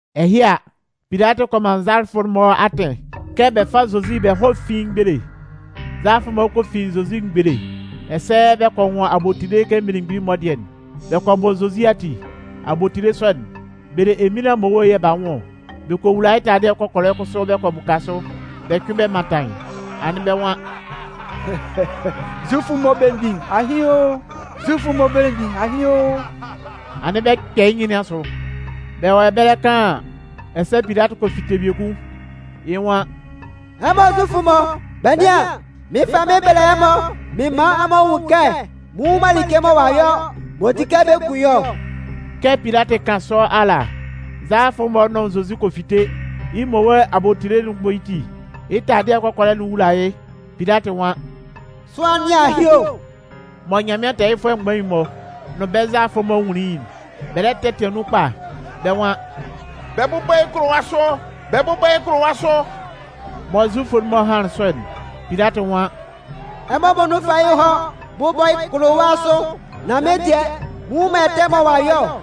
Ɛhɩ a, Pilatɩ kɔ man nzalafʋ'n-mɔ atɩn kɛ bɛ fá Zozi bɛ hɔ́ fín yɩ́ mgbele. Nzalafʋ'n-mɔ kɔ fin Zozi mgbele ɛsɛ bɛ kɔ nwʋn abotile kɛ mmelemgbin'n-mɔ dɩɛ'n, bɛ kɔ bɔ Zozi ati. Abotile sɔ'n, bɛ le eminlan mmowe yɛ̂ b'a nwʋn ɔ. Bɛ kɔ wula yɩ́ taladɩɛ kɔkɔlɛ kʋsʋ bɛ kɔ bʋka sʋ. Bɛ cʋɩn bɛ mantan yɩ́, anɩn bɛ́ nwan: “Zufʋ'n-mɔ belemgbin, ahɩn o! Zufʋ'n-mɔ belemgbin, ahɩn o!” Anɩn bɛ 'kpɛ yɩ́ nyɩn nɩn asʋ. Bɛ wɔ ɛbɛlɛ kaan an, ɛsɛ Pilatɩ kɔ fite biekun, yɩ́ nwan: “Ɛmɔ Zufʋ'n-mɔ, bɛ nɩ́an, mɩɩn fa yɩ́ mɩn bɛlɛ ɛmɔ mɩn man ɛmɔ nwun kɛ mɩn nnwun man like mɔ ɔ'a yɔ m'ɔ di kɛ bɛ kun yɩ́ ɔ.” Kɛ Pilatɩ 'kan sɔ ala, nzalafʋ'n-mɔ nʋn Zozi kɔ fite, yɩ́ mmowe abotile'n bɔ yɩ́ ti, yɩ́ taladɩɛ kɔkɔlɛ'n wula yɩ́. Pilatɩ nwan: “Sʋanlan nɩn ahɩ o!” Mɔ Nyanmɩan tɛɛyɩfʋɛ mgbain'n-mɔ nʋn bɛ́ nzalafʋ'n-mɔ nwunlin yɩ́'n, bɛ lɛ tɛtɩan nun kpa, bɛ́ nwan: “Bɛ bʋ́bɔ yɩ́ kʋlʋwa sʋ, bɛ bʋ́bɔ yɩ́ kʋlʋwa sʋ!” Mɔ Zufʋ'n-mɔ hanlɩn sɔ'n, Pilatɩ nwan: “Ɛmɔ muonun fá yɩ́ hɔ́ bʋ́bɔ yɩ́ kʋlʋwa sʋ, nan mɩ́n dɩɛ, mɩn nnwun man ɛtɛ mɔ ɔ'a yɔ ɔ.”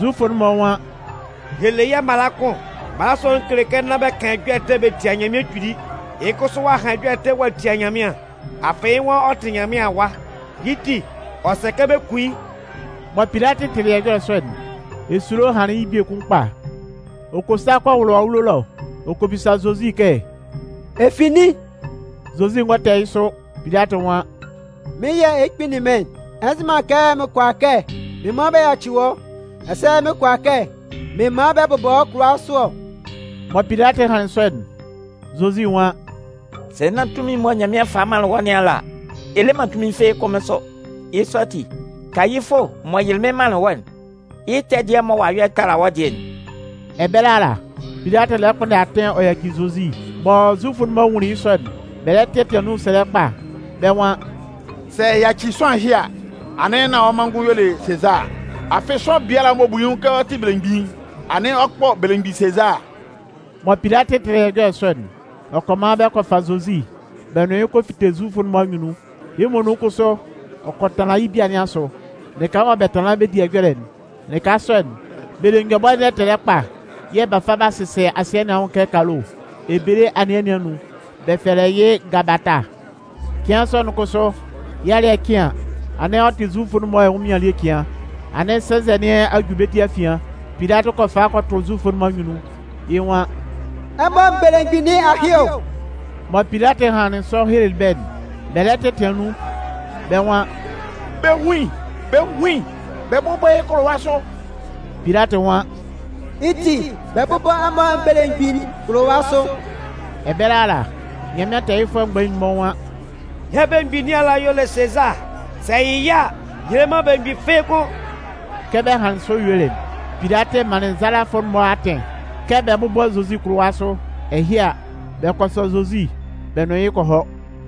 Zufʋ'n-mɔ nwan: “Yɛ le yɛ́ mala kʋn, mala sɔ'n kele kɛ nán bɛ kan ɛjɔlɛ ɛtɛ bɛ tia Nyanmɩan Kpili. Yɩ́ kʋsʋ ɔ'a han ɛjɔlɛ ɛtɛ ɔ'a tia Nyanmɩan, afɩ yɩ́ nwan ɔ tɩ Nyanmɩan Awa, yɩ́ ti, ɔ sɛ kɛ bɛ kun yɩ́.” Mɔ Pilatɩ tɩlɩ ɛjɔlɛ sɔ'n, esulo hanlɩn yɩ́ biekun kpa. Ɔ kɔ sa kɔ wʋlʋ awulo ɛlɔ, ɔ kɔ bisa Zozi kɛ: “Ɛ fi nin?” Zozi ngɔ tɛ yɩ́ sʋ. Pilatɩ nwan: “Mɩ́n yɛ̂ ɛ lɛ kpinlin mɩ́n'n? Ɛ nzɩ man kɛ mɩn kʋala kɛ mɩn man bɛ yaci wɔ́, ɛsɛ mɩn kʋala kɛ mɩn man bɛ bʋbɔ wɔ́ kʋlʋwa sʋ ɔ?” Mɔ Pilatɩ hanlɩn sɔ'n, Zozi nwan: “Sɛ nán tunmin'n mɔ Nyanmɩan falɩ manlɩn wɔ́ nɩn ala a, ɛ le man tunmin fɩ́ɩ́ kʋ́n mɩ́n sʋ. Yɩ́ sɔ ati, Kayifʋ m'ɔ yɩlɩ mɩ́n manlɩn wɔ́'n, yɩ́ ɛtɛ dɩɛ mɔ ɔ'a yɔ'n tala wɔ́ dɩɛ'n.” Ɛbɛlɛ ala, Pilatɩ lɛ kpʋnndɛ atɩn ɔ yaci Zozi. Mɔ Zufʋ'n-mɔ nwunlin yɩ́ sɔ'n, bɛ lɛ tɛtɩan nun sɛlɛ kpa, bɛ́ nwan: “Sɛ ɛ yaci sʋanlan ɛhɩ a, anɩn nán wɔ́ manngʋn y'ɔ le Sezaa, afɩ sʋanlan biala m'ɔ bu yɩ́ nwʋn kɛ ɔ tɩ belemgbin'n, anɩn ɔ kpɔ belemgbin Sezaa.” Mɔ Pilatɩ tɩlɩ ɛjɔlɛ sɔ'n, ɔ kɔ man bɛ kɔ fa Zozi bɛ nʋn yɩ́ kɔ fite Zufʋ'n-mɔ anyunnun. Yɩ́ muonun kʋsʋ ɔ kɔ tanlan yɩ́ bia nɩn asʋ, lɩka mɔ bɛ tanlan bɛ di ɛjɔlɛ'n. Lɩka sɔ'n, bɛ le nyɔbʋɛ ndɛtɛlɛ kpa yɛ̂ b'a fa b'a sɩsɛ asɩɛ nɩn anwʋn kɛ kalo. Ebele anɩɛ nɩn anun, bɛ fɛlɛ yɩ́ “gabata”. Cɩan sɔ'n kʋsʋ, yɩ́ alɩ́ɛ cɩn an, anɩn ɔ tɩ Zufʋ'n-mɔ ɛnwʋnmɩan ele cɩan. Anɩn sɛnzɛ nɩn a ju bɛ́ ti afian. Pilatɩ kɔ fa kɔ tʋ Zufʋ'n-mɔ anyunnun, yɩ́ nwan: “Ɛmɔ belemgbin nɩn ahɩ o!” Mɔ Pilatɩ hanlɩn sɔ helelɩ bɛ́'n, bɛ lɛ tɛtɩan nun, bɛ́ nwan: “Bɛ hún yɩ́! Bɛ hún yɩ́! Bɛ bʋ́bɔ yɩ́ kʋlʋwa sʋ!” Pilatɩ nwan: “Yɩ́ ti, bɛ bʋ́bɔ ɛmɔ belemgbin'n kʋlʋwa sʋ?” Ɛbɛlɛ ala, Nyanmɩan tɛɛyɩfʋɛ mgbain'n-mɔ nwan: “Yɛ́ belemgbin nɩn ala y'ɔ le Sezaa, sɛ ɛ yɩ yɩ́ a, yɛ le man belemgbin fɩ́ɩ́ kʋ́n.” Kɛ bɛ hanlɩn sɔ yuelɩ'n, Pilatɩ manlɩn nzalafʋ'n-mɔ atɩn kɛ bɛ bʋ́bɔ Zozi kʋlʋwa sʋ. Ɛhɩ a, bɛ kɔ sɔ Zozi bɛ nʋn yɩ́ kɔ hɔ.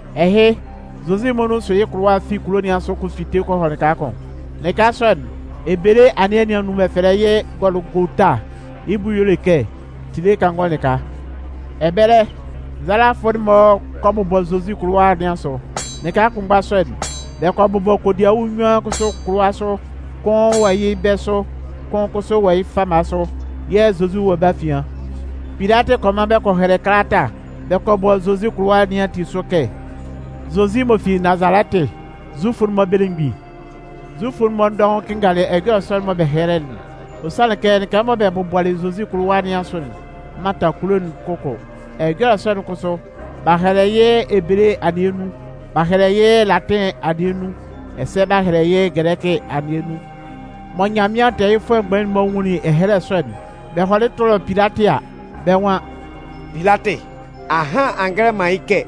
Ɛhɩ, Zozi muonun sʋ yɩ́ kʋlʋwa'n fi kulo nɩn asʋ ɔ kɔ fite kɔ hɔ lɩka kʋn. Lɩka sɔ'n, ebele anɩɛ nɩn anun bɛ fɛlɛ yɩ́ “Gɔlʋgota”, yɩ́ bʋ y'ɔ le kɛ “tile kangɔ lɩka.” Ɛbɛlɛ, nzalafʋ'n-mɔ kɔ bʋbɔ Zozi kʋlʋwa nɩn asʋ. Lɩka kʋnmgba sɔ'n, bɛ kɔ bʋbɔ kodiawu nnyuan kʋsʋ kʋlʋwa sʋ, kʋn wɔ yɩ́ bɛ̂ sʋ, kʋn kʋsʋ wɔ yɩ́ fama sʋ, yɛ̂ Zozi wɔ bɛ́ afian. Pilatɩ kɔ man bɛ kɔ hɛlɛ kalata bɛ kɔ bɔ Zozi kʋlʋwa nɩn ati sʋ kɛ: “Zozi m'ɔ fi Nazalɛtɩ, Zufʋ'n-mɔ belemgbin.” Zufʋ'n-mɔ dɔʋn kɩnngalɩ ɛjɔlɛ sɔ'n mɔ bɛ hɛlɛlɩ'n, ɔ sanlɩn kɛ lɩka mɔ bɛ bʋbɔlɩ Zozi kʋlʋwa nɩn asʋ'n mantan kulo'n kʋkʋ. Ɛjɔlɛ sɔ'n kʋsʋ, b'a hɛlɛ yɩ́ ebele anɩɛ nun, b'a hɛlɛ yɩ́ latɩn anɩɛ nun, ɛsɛ b'a hɛlɛ yɩ́ gɛlɛkɩ anɩɛ nun. Mɔ Nyanmɩan tɛɛyɩfʋɛ mgbain'n-mɔ nwunlin ɛhɛlɛ sɔ'n, bɛ hɔlɩ tʋlɩ Pilatɩ a, bɛ́ nwan: “Pilatɩ, ahan a ngɛlɛ man yɩ́ kɛ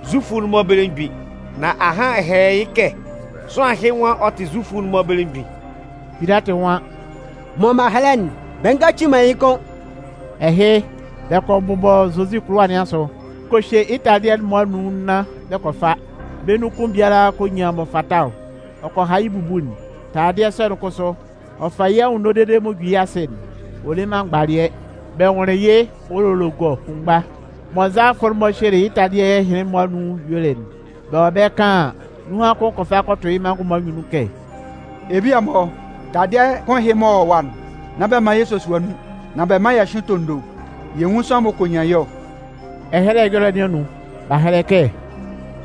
‘Zufʋ'n-mɔ belemgbin’, nan ahan ɛ hɛlɛlɩ yɩ́ kɛ ‘sʋanlan ɛhɩ nwan ɔ tɩ Zufʋ'n-mɔ belemgbin.’” Pilatɩ nwan: “Mɔ m'an hɛlɛ'n, bɛ ngaci man yɩ́ kʋ́n.” Ɛhɩ, bɛ kɔ bʋbɔ Zozi kʋlʋwa nɩn asʋ, bɛ kɔ hye yɩ́ taladɩɛ'n-mɔ anun nnan bɛ kɔ fa. Bɛ́ nun kʋn biala kɔ nyan m'ɔ fata ɔ. Ɔ kɔ ha yɩ́ bubu'n. Taladɩɛ sɔ'n kʋsʋ, ɔ fa yɩ́ anwunno dede m'ɔ ju yɩ́ asɩ'n, ɔ le man mgbalɩɛ, bɛ nwʋnlɩn yɩ́ wolologɔ kʋnmgba. Mɔ nzalafʋ'n-mɔ hyelɩ yɩ́ taladɩɛ ɛhɩnlɩn-mɔ anun yuelɩ'n, bɛ wɔ ɛbɛlɛ kaan an, nunhan kʋn kɔ fa kɔ tʋ yɩ́ manngʋn'n-mɔ anyunnun kɛ: “Ebia-mɔ, taladɩɛ kʋn ɛhɩ m'ɔ wɔ ɛwa'n, nán bɛ man yɛ sosua nun, nan bɛ mán yɛ hyʋ́ɩn tondo yɛ nwún sʋanlan m'ɔ kɔ nyan yɩ́ ɔ.” Ɛhɛlɛ Ɛjɔlɛ nɩn anun, b'a hɛlɛ kɛ: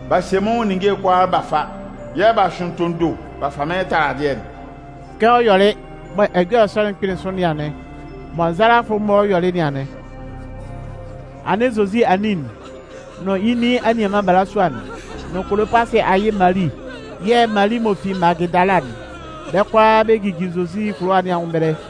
B'a hye mɩ́n nwʋn ninnge'n-mɔ b'a fa, yɛ̂ b'a hyʋɩn tondo b'a fa mɩ́n taladɩɛ'n. Kɛ ɔ yɔlɩ mɔ ɛjɔlɛ sɔ'n kpɩnlɩn sʋ nɩn anɩn. Mɔ nzalafʋ'n-mɔ yɔlɩ nɩn anɩn. Anɩn Zozi anin'n nʋn yɩ́ nin anianman balasua'n nʋn Kolopasɩ ayɩ Mali yɛ̂ Mali m'ɔ fi Magɩdala'n, bɛ́ kʋalaa bɛ jijin Zozi kʋlʋwa nɩn anwʋn ɛbɛlɛ.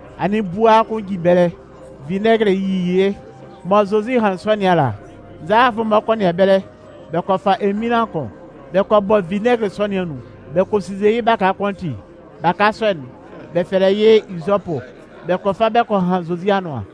Anɩn bua kʋn jin ɛbɛlɛ, vinɛgɩlɩ yi yɩ́. Mɔ Zozi hanlɩn sɔ nɩn ala, nzalafʋ'n-mɔ kɔ nɩan ɛbɛlɛ bɛ kɔ fa eminlan kʋn bɛ kɔ bɔ vinɛgɩlɩ sɔ nɩn anun. Bɛ kɔ sinnze yɩ́ baka kʋn ati. Baka sɔ'n, bɛ fɛlɛ yɩ́ Izɔpʋ. Bɛ kɔ fa bɛ kɔ han Zozi anʋan.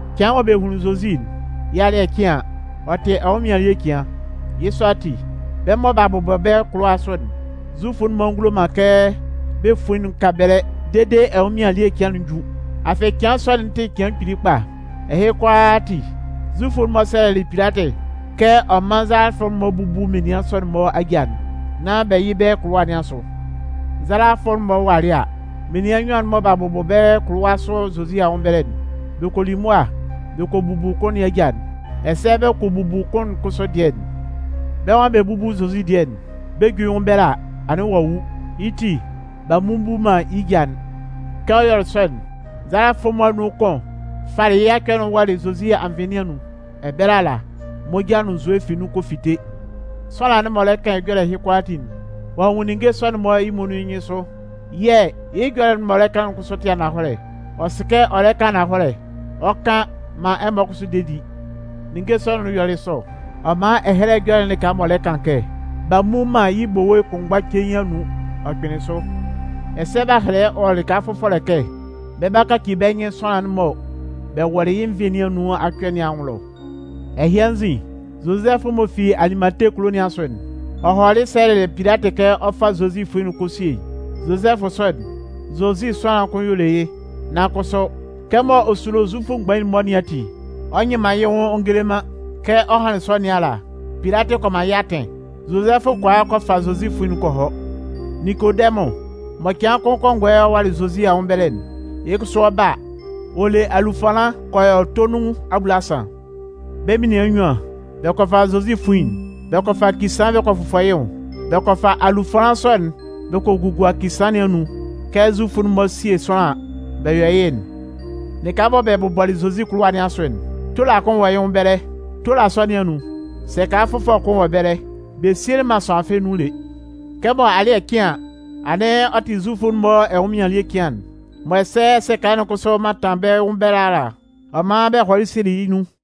Cɩan mɔ bɛ hunlin Zozi'n, yɩ́ alɩ́ɛ cɩn an, ɔ tɩ ɛnwʋnmɩan elie cɩan. Yɩ́ sɔ ati, bɛ́ mɔ b'a bʋbɔ bɛ́ kʋlʋwa sʋ'n, Zufʋ'n-mɔ ngulo man kɛ bɛ́ fuin'n ka ɛbɛlɛ dede ɛnwʋnmɩan elie cɩan'n ju. Afɩ cɩan sɔ'n tɩ cɩan kpili kpa. Ɛhɩ kʋalaa ati, Zufʋ'n-mɔ sɛlɛlɩ Pilatɩ kɛ ɔ mán nzalafʋ'n-mɔ búbu menian sɔ'n-mɔ aja'n, nán bɛ yɩ́ bɛ́ kʋlʋwa nɩn asʋ. Nzalafʋ'n-mɔ walɩ a, menian nnyuan'n mɔ b'a bʋbɔ bɛ́ kʋlʋwa sʋ Zozi anwʋn ɛbɛlɛ'n, bɛ kɔ li mʋa bɛ kɔ bubu kʋn nɩn aja'n, ɛsɛ bɛ kɔ bubu kʋn'n kʋsʋ dɩɛ'n. Bɛ́ nwan bɛ 'bubu Zozi dɩɛ'n, bɛ 'ju yɩ́ nwʋn ɛbɛlɛ a, anɩn ɔ'a wu. Yɩ́ ti, b'a mmubu man yɩ́ ja'n. Kɛ ɔ yɔlɩ sɔ'n, nzalafʋ'n-mɔ anun kʋn falɩ yɩ́ acɔ'n wɔlɩ Zozi anvɩn nɩn anun. Ɛbɛlɛ ala, moja nʋn nzue fi nun kɔ fite. Sʋanlan'n m'ɔ lɛ kan ɛjɔlɛ ɛhɩ kʋalaatin'n, ɔ'a nwun ninnge sɔ'n-mɔ yɩ́ muonun yɩ́ nyɩnsʋ. Yɛ̂ yɩ́ ɛjɔlɛ'n m'ɔ lɛ kan'n kʋsʋ tɩ ananhɔlɛ. Ɔ sɩ kɛ ɔ lɛ kan ananhɔlɛ, ɔ 'kan maan ɛmɔ kʋsʋ de di. Ninnge sɔ'n yɔlɩ sɔ, ɔ man Ɛhɛlɛ Ɛjɔlɛ'n lɩka m'ɔ lɛ kan kɛ: B'a mmu man yɩ́ bowe kʋnmgba cein anun, ɔ kpɩnlɩn sʋ. Ɛsɛ b'a hɛlɛ wɔ lɩka fʋfɔlɛ kɛ: Bɛ 'ba kaci bɛ́ nyɩn sʋanlan'n mɔ bɛ wɔlɩ yɩ́ nvɩn nɩn anun acɔ nɩn anwʋn ɛlɔ. Ɛhɩ anzin, Zozɛfʋ m'ɔ fi Alimate kulo nɩn asʋ'n, ɔ hɔlɩ sɛlɛlɩ Pilatɩ kɛ ɔ 'fa Zozi fuin'n ɔ 'kɔ a sie yɩ́. Zozɛfʋ sɔ'n, Zozi sʋanlan kʋn y'ɔ le yɩ́, nan kʋsʋ, kɛmɔ ɔ sulo Zufʋ mgbain'n-mɔ nɩn ati, ɔ nyɩ man yɩ́ nwʋn ɔ ngele man. Kɛ ɔ hanlɩn sɔ nɩn ala, Pilatɩ kɔ man yɩ́ atɩn. Zozɛfʋ kɔ a kɔ fa Zozi fuin'n kɔ hɔ. Ninkodɛmʋn mɔ cɩan kʋn kɔngɔɛ ɔ walɩ Zozi anwʋn ɛbɛlɛ'n, yɩ́ kʋsʋ ɔ 'ba a, ɔ le alufanlan kɔ yɔ tonun abulasan. Bɛ́ menian nnyuan, bɛ kɔ fa Zozi fuin'n, bɛ kɔ fa kisaan bɛ kɔ fʋfɔ yɩ́ nwʋn. Bɛ kɔ fa alufanlan sɔ'n bɛ kɔ gugua kisaan nɩn anun kɛ Zufʋ'n-mɔ 'sie sʋanlan an, bɛ yɔ yɩ́'n. Lɩka mɔ bɛ bʋbɔlɩ Zozi kʋlʋwa nɩn asʋ'n, tola kʋn wɔ yɩ́ nwʋn ɛbɛlɛ. Tola sɔ nɩn anun, sɛka fʋfɔlɛ kʋn wɔ ɛbɛlɛ, bɛ sielɩ man sʋanlan fɩ́ɩ́ nun lé. Kɛmɔ alɩ́ɛ cɩn an, anɩn ɔ tɩ Zufʋ'n-mɔ ɛnwʋnmɩan elie cɩan'n, mɔ ɛsɛ sɛka'n kʋsʋ mantan bɛ́ nwʋn ɛbɛlɛ ala'n, ɔ man bɛ hɔlɩ sielɩ yɩ́ nun.